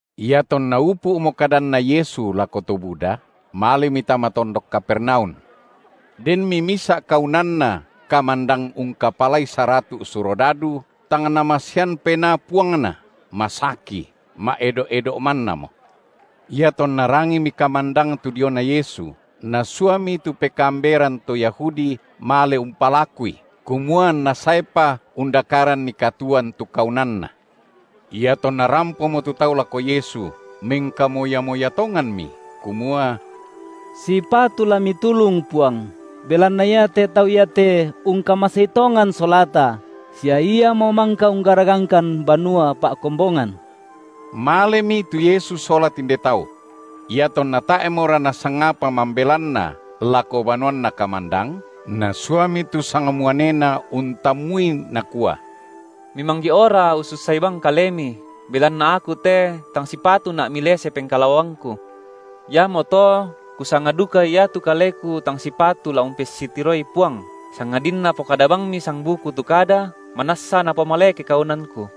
Iatonna upu’mo kadanna Yesu lako to buda, malemi tama tondok Kapernaum. Denmi misa’ kaunanna kamandang ungkapalai saratu’ surodadu, tang namasean penaa puangna, masaki, ma’edo’-edo’ mannamo. Iatonna rangimi kamandang tu diona Yesu, nasuami tu pekaamberan to Yahudi male umpalakui, kumua anNa saepa undakaranni katuoan tu kaunanna. Iatonna rampomo tu tau lako Yesu, mengkamoya-moya tonganmi, kumua: Sipatu la Mitulung, Puang, belanna iate tau iate ungkamasei tongan solata sia iamo mangka unggaragangkan banua pa’kombongan. Malemi tu Yesu sola tinde tau. Iatonna tae’mora nasangapa mambelanna lako banuanna kamandang, nasuami tu sangmuanena untammui, nakua: Mimanggi’ora ussussai bang Kalemi, belanna aku te tang sipatuna’ Milese pengkalaoangku; iamoto kusanga duka iatu kaleku tang sipatu la umpessitiroi Puang, sangadinna pokada bangmi sangbuku tu kada, manassa napomaleke kaunanku.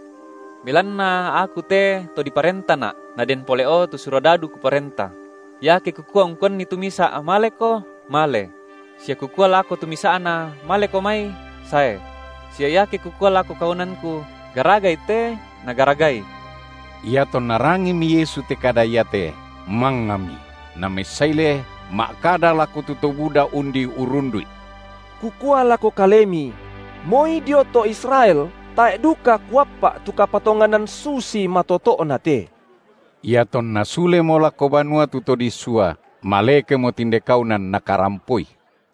Belanna aku te to diparentana’, naden pole’o tu surodadu kuparenta; iake kukua ungkuanni tu misa’: maleko, male; sia kukua lako tu misa’na: maleko mai, sae; sia iake kukua lako kaunanku: garagai te, nagaragai. Iatonna rangimi Yesu te kada iate, mangngami, Namessaile ma’kada lako tu to buda undi unrrundu’I: Kukua lako kalemi: Moi dio to Israel tae’ duka Kuappa’ tu kapatonganan susi matoto’na te. Iatonna sulemo lako banua tu to disua, malekemo tinde kaunan nakarampoi.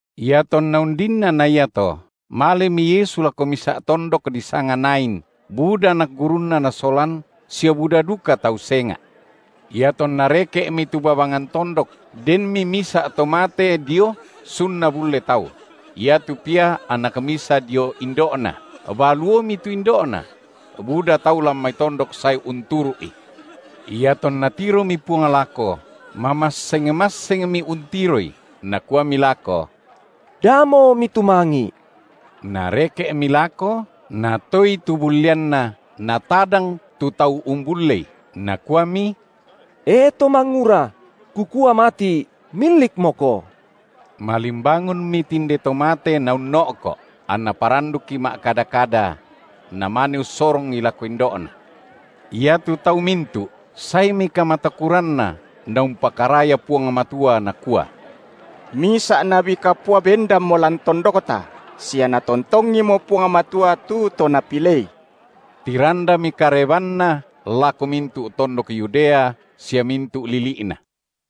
Iatonna undinna na iato, malemi Yesu lako misa’ tondok disanga Nain, buda anak gurunNa Nasolan sia buda duka tau senga’. Iatonna reke’mi tu babangan tondok, denmi misa’ to mate dio sun nabulle tau; iatu pia anak misa dio indo’na, baluomi tu indo’na; buda tau lan mai tondok sae unturu’i. Iatonna tiromi Puang lako, mamasseng-massengmi untiroi, Nakuami lako: Damo mitumangi’! Nareke’mi lako, Natoei tu bulleanna natadang tu tau umbullei, Nakuami: E to mangura! Kukua mati’, millikmoko! Malimbangunmi tinde to mate naunno’ko’, anna parandukki ma’kada-kada; Namane ussorongi lako indo’na. Iatu tau mintu’, saemi kamatakuranna, naumpakaraya Puang Matua, nakua: Misa’ nabi kapua bendanmo lan tondokta, sia Natontongimo Puang Matua tu to Napilei. Tirandami karebanNa lako mintu’ tondok Yudea sia mintu’ lili’na.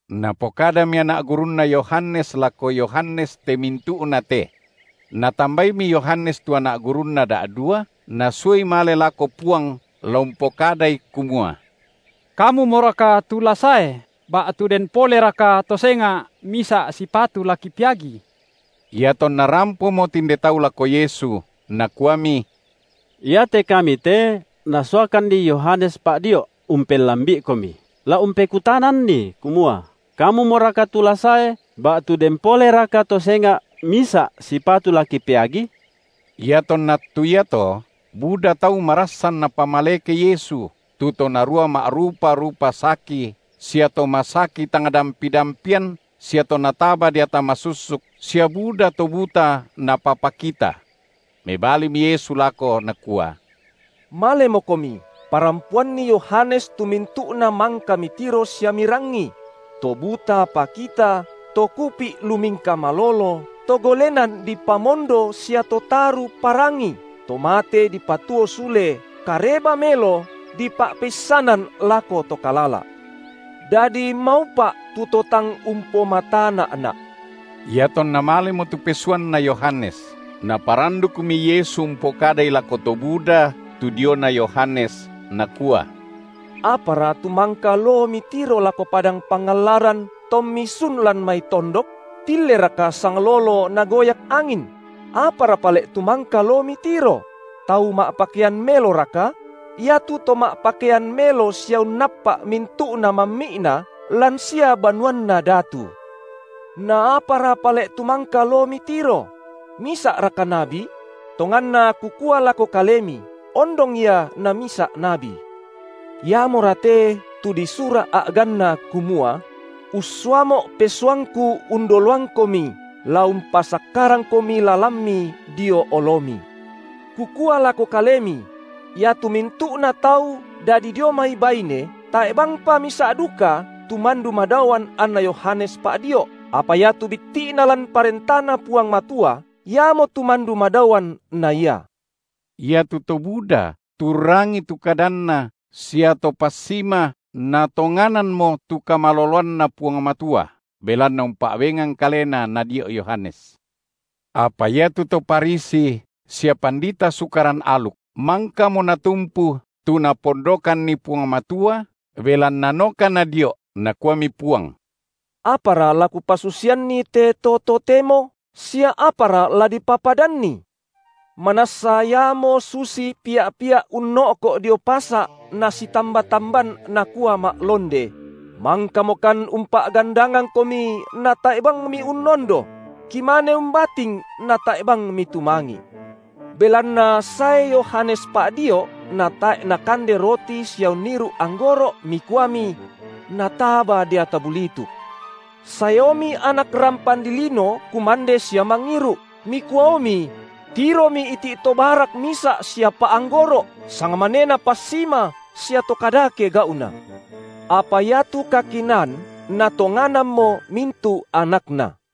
Napokadami anak gurunna Yohanes lako Yohanes te mintu’na te. Natambaimi Yohanes tu anak gurunna da’dua, nasuai male lako Puang la umpokadai, kumua: Kamumoraka tu la sae ba’tu den poleraka to senga’ misa’ sipatu la kipeagi? Iatonna rampomo tinde tau lako Yesu, nakuami: Iate kami te nasuakanni Yohanes Pa’dio’, umpellambi’iKomi, la umpekutananni, kumua: Kamumoraka tu la sae, ba’tu den poleraka to senga’ misa’ sipatu la kipeagi’? Iatonna attu iato, buda tau marassan Napamaleke Yesu, tu to narua ma’rupa-rupa saki sia to masaki tang dampi-dampian sia to nataba deata masussuk sia buda to buta Napapakita. Mebalimi Yesu lako, Nakua: Malemokomi, parampoanni Yohanes tu mintu’na mangka mitiro sia mirangi: To buta pakita, to kupi’ lumingka malolo, to golenan dipamondo sia to taru parangi, to mate dipatuo sule, Kareba melo dipa’peissanan lako to kalala’. Dadi maupa’ tu to tang umpomatana’Na’. Iatonna malemo tu pesuanna Yohanes, Naparandukmi Yesu umpokadai lako to buda tu diona Yohanes, Nakua: Apara tu mangka loo mitiro lako Padang Pangallaran, tommi sun lan mai tondok? Tilleraka sanglolo nagoyak angin? Apara pale’ tu mangka loo mitiro? Tau ma’pakean meloraka? Iatu to ma’pakean melo sia unnappa’ mintu’na mammi’na, lan sia banuanna datu. Naapara pale’ tu mangka loo mitiro? Misa’raka nabi? Tonganna Kukua lako kalemi, ondong ia na misa’ nabi. Iamora te, tu disura’ a’ganna, kumua: UssuaMo’ pesuangKu undoloangKomi, La umpasakkarangKomi lalanMi dio oloMi. Kukua lako Kalemi: iatu mintu’na tau dadi dio mai baine tae’ bangpa misa’ duka tu mandu madaoan anna Yohanes Pa’dio’ apa iatu bitti’na lan ParentaNa Puang Matua, iamotu mandu madaoan na ia. Iatu to buda tu urrangii tu kadanNa sia to passima natonganammo tu kamaloloanNa Puang Matua, belanna umpa’bengan kalena nadio’ Yohanes. Apa iatu to Farisi sia pandita Sukaran aluk mangkamo natumpu tu Napondokanni Puang Matua, belanna noka nadio’, Nakuami Puang: Apara la Kupasusianni te to totemo sia apara la dipapadanni? Manassa iamo susi pia’-pia’ unno’ko’ dio pasa’ nasitamba-tamban, nakua (ma’londe): Mangkamokan umpa’gandangangkomi natae’ bang miunnondo; Kimane umbating, natae’ bang mitumangi’. Belanna sae Yohanes Pa’dio’ natae’ nakande roti sia unniru’ anggoro’ mikuami: Nataba deata bulituk. Saeomi Anak rampan dilino kumande sia mangiru’, mikuaomi: Tiromi iti’ to barak misa’ sia pa’anggoro’, sangmanena passima sia to kadake gau’na. Apa iatu kakinaan natonganammo mintu’ anakna.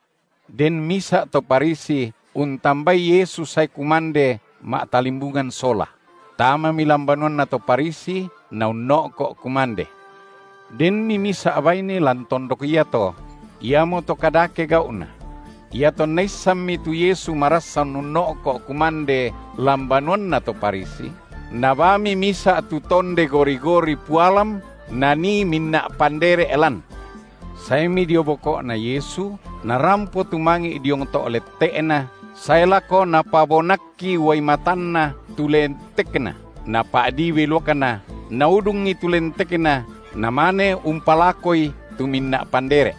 Den misa’ to Farisi untambai Yesu sae kumande ma’talimbungan sola; tamami lan banuanna to Farisi, Naunno’ko’ kumande. Denmi misa’ baine lan tondok iato, iamoto kadake gau’na; iatonna issanmi tu Yesu marassan unno’ko’ kumande lan banuanna to Farisi, nabaami misa’ tu tonde gori-gori pualam nanii minna’ pandere’ lan. Saemi dio boko’Na Yesu, narampo tumangi’ diong to’ lette’Na, sae lako napabonakki uai matanna tu lentekNa, napa’dii beluakna, naudungi tu lentekNa, namane umpalakoi tu minna’ pandere’.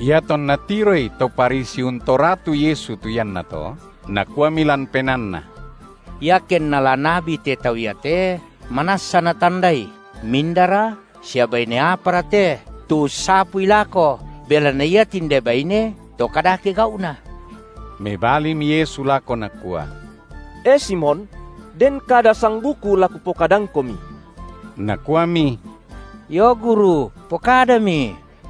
Iatonna tiroi to Farisi untoratu Yesu tu iannato, nakuami lan penaanna: Iakenna la nabi te Tau iate, manassa Natandai, mindara, sia baine apara te, tu ussapui lako, belanna ia tinde baine to kadake gau’na! Mebalimi Yesu lako Nakua: E Simon! den kada sangbuku la Kupokadangkomi. Nakuami: Io, guru, pokadami.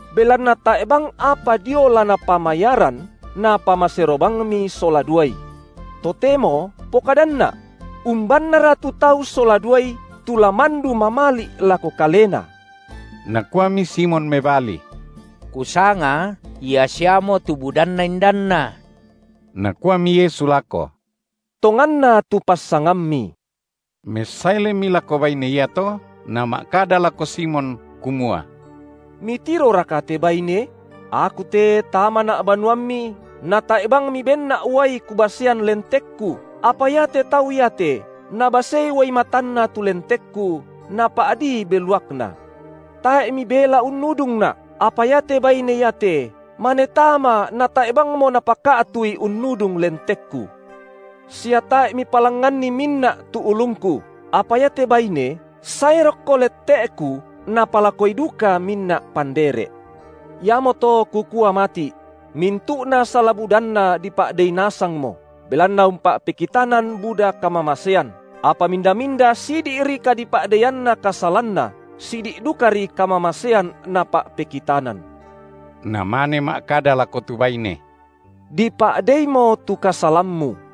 Belanna tae’ bang apa dio la napamayaran, napamasero bangmi sola duai. Totemo pokadanNa’: Umbannara tu tau sola duai, tu la mandu mamali’ lako kalena? Nakuami Simon mebali: Kusanga, ia siamo tu budanna indanna. Nakuami Yesu lako: Tonganna tu passangammi. Messailemi lako baine iato Nama’kada lako Simon, kumua: Mitiroraka te baine? Aku te tamaNa’ banuammi, natae’ bang mibenNa’ uai Kubasean lentekKu, apa iate tau iate nabasei uai matanna tu lentekKu, napa’dii beluakna. Tae’ mibela unnudungNa’ apa iate baine iate mane tama, natae’ bangmo napaka’tui unnudung lentekKu. Sia tae’ mipalangnganni minna’ tu ulungKu, apa iate baine sae rokko lette’Ku napalakoi duka minna’ pandere’. Iamoto Kukua mati’: Mintu’na sala-budanna dipa’dei nasangmo, belanna umpa’pekitanan buda kamamasean, apa minda-minda sidi’ri kadipa’deianna kasalanna, sidi’ dukari kamamasean napa’pekitanan. Namane ma’kada lako tu baine: Dipa’deimo tu kasalammu.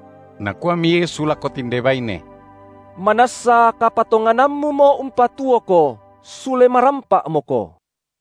Nakuami Yesu lako tinde baine: Manassa kapatonganammumo umpatuoko, sule marampa’moko.